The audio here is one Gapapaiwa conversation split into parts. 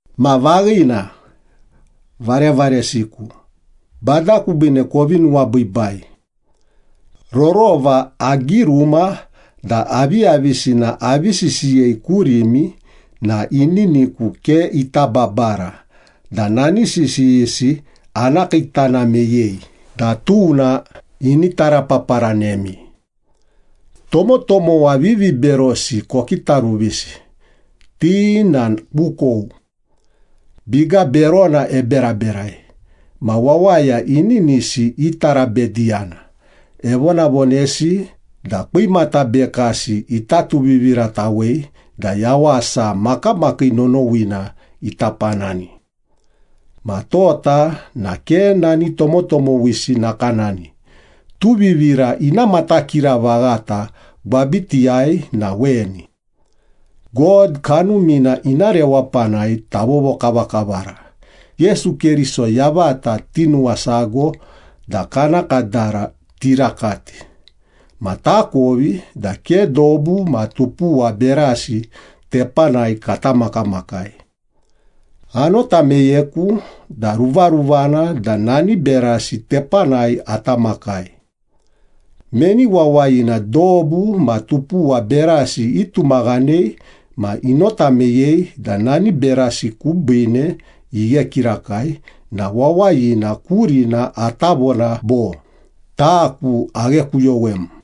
Ma vaghina, varevaresiku, Bada kubiine kovi nuwabiibai. Rorova agiruma da aviyavisina avi sisiyei kurimi na ininiku ke ita babara da nani sisiyisi ana kiitana meyei da tuna ini tarapaparanemi. Tomotomowa viviberosi kokitaruvisi, ti na kukou. Biga berona eberaberai, ma wawaya ininisi itarabediyana, evonavonesi da kwimata bekasi ita tuviviratawei da yawasa makamakii nonowina ita panani. Ma tota na ke nani tomotomowisi nakanani, tuvivira ina matakira vaghata gwabitiyai na weni. God Kanumina ina rewapanai tavovokavakavara, Yesu Keriso yavata tinuwasago da kana kadara tirakati, ma takovi da ke dobu ma tupuwa berasi tepanai kata makamakai. Anota meyeku da ruvaruvana da nani berasi tepanai ata makai. Meni wawayina dobu ma tupuwa berasi itumaghanei ma inota meyei da nani berasi kubiine ighe kirakai na wawayina kurina ata vona bo, “Taku aghekuyowem.”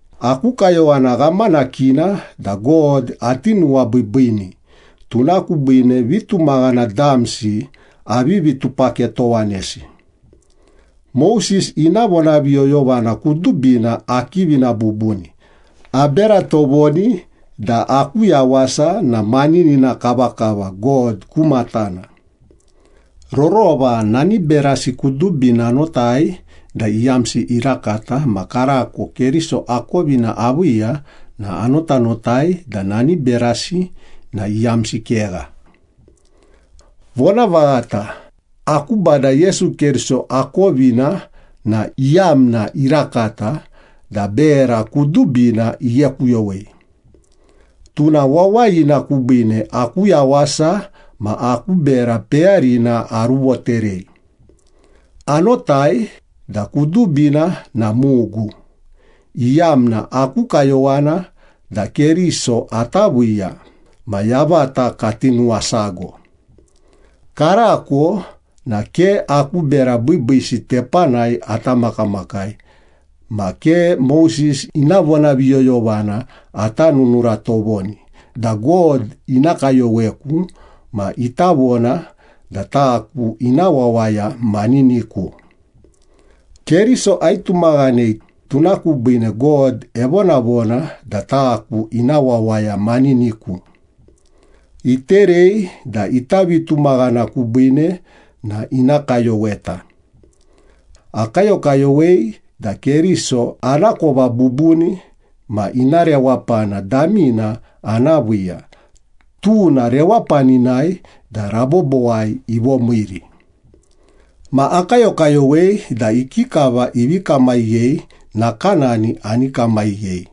Aku kayowana ghamanakina da God ati nuwabiibiini, tuna kubiine vitumaghana damsi avivi tupaketowanesi. Moses ina vonaviyoyovana kudubina akivina bubuni, abera tovoni da aku yawasa na maninina kavakava God ku matana. Rorova nani berasi kudubina anotai da iyamsi irakata ma karako Keriso akovina aviiya na anotanotai da nani berasi na iyamsi kegha. Vonavaghata, aku Bada Yesu Keriso akovina na iyamna irakata da bera kudubina ighekuyowei. Tuna wawayina kubiine aku yawasa ma aku bera peyarina aruvoterei. Anotai da kudubina na mugu, iyamna aku kayowana da Keriso ata viiya ma yavata kati nuwasago. Karako na ke aku bera biibiisi tepanai ata makamakai ma ke Moses ina vonaviyoyovana ata nunura tovoni da God ina kayoweku ma ita vona da taku ina wawaya maniniku. Keriso aitumaghanei, tuna kubiine God evonavona da taku ina wawaya maniniku. Iterei da ita vitumaghana kubiine na ina kayoweta. Akayokayowei da Keriso anakova bubuni, ma ina rewapana damina ana viiya, tuna rewapaninai da rabobowai ivomiiri. Ma akayokayowei da ikikava ivi kamaghiyei, nakanani ani kamaghiyei.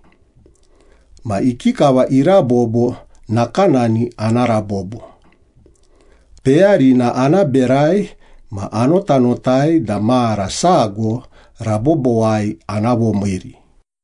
Ma ikikava irabobo, nakanani ana rabobo. Peyarina ana berai ma anotanotai da mara sago rabobowai ana vomiiri.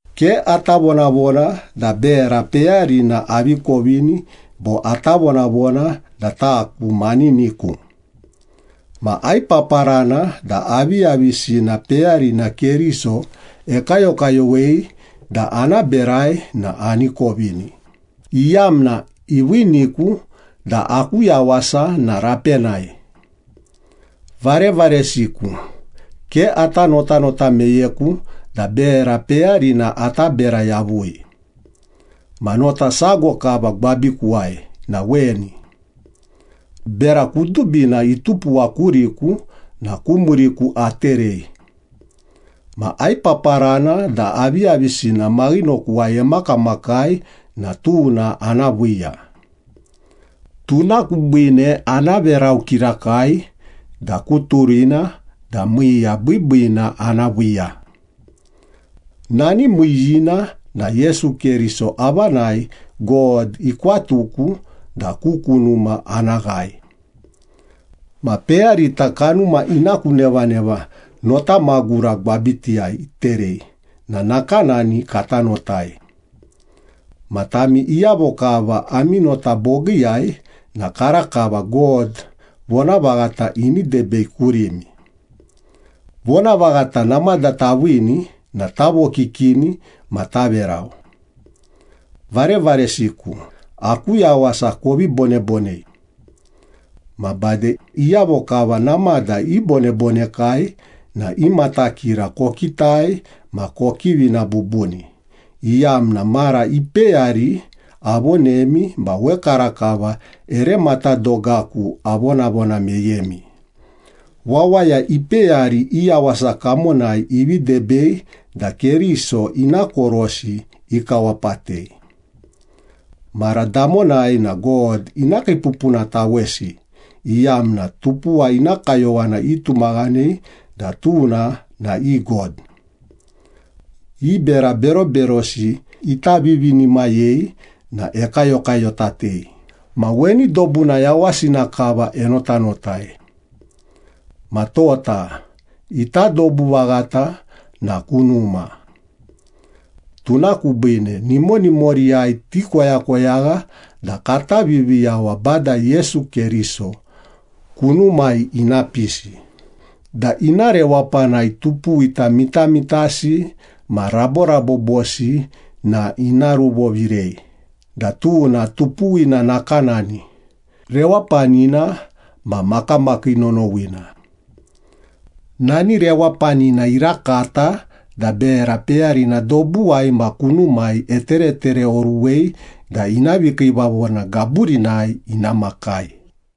Ke ata vonavona da bera peyarina avi kovini bo ata vonavona da taku maniniku. Ma aipaparana da aviyavisina peyarina Keriso ekayokayowei da ana berai na ani kovini, iyamna iviiniku da aku yawasa na rapenai. Varevaresiku, ke ata notanota meyeku da bera peyarina ata bera yavui. Ma nota sago kava gwabikuwai na weni. Bera kudubina itupuwa kuriku na ku muriku aterei. Ma aipaparana da aviyavisina maghinokuwai emakamakai na tuna ana viiya. Tuna kubiine ana verau kirakai da ku turina da miiya biibiina ana viiya. Nani miiyiina na Yesu Keriso avanai God ikwatuku da ku kunuma ana ghae. Ma peyarita kanuma ina ku nevaneva nota magura gwabitiyai iterei na nakanani kata notai. Ma tami iyavo kava ami nota bogiiyai na karakava God vonavaghata ini debei kurimi. Vonavaghata namada taviini na tavokikini ma taverau. Varevaresiku, aku yawasa kovi bonebonei. Ma bade, iyavo kava namada ibonebonekai na i matakira kokitai ma kokivina bubuni, iyamna, mara ipeyari avonemi ma wekarakava ere matadogaku avonavona meyemi, wawaya ipeyari i yawasa kamonai ivi debei da Keriso ina korosi ikawapatei. Mara damonai na God ina kiipupunatawesi, iyamna tupuwa ina kayowana itumaghanei da tuna na i god. I bera beroberosi ita vivinimayei na ekayokayotatei ma weni dobuna yawasina kava enotanotai. Ma tota, ita dobu vaghata na kunuma. Tuna kubiine, nimonimoriyai tikoyakoyagha da kata Viviyawa Bada Yesu Keriso, kunumai ina pisi, da ina rewapanai tupuwita mitamitasi ma raborabobosi na ina ruvovirei da tuna tupuwina nakanani, rewapanina ma makamakii nonowina. Nani rewapanina irakata da bera peyarina dobuwai ma kunumai eteretereoruwei da ina vikiivavona gaburinai ina makai.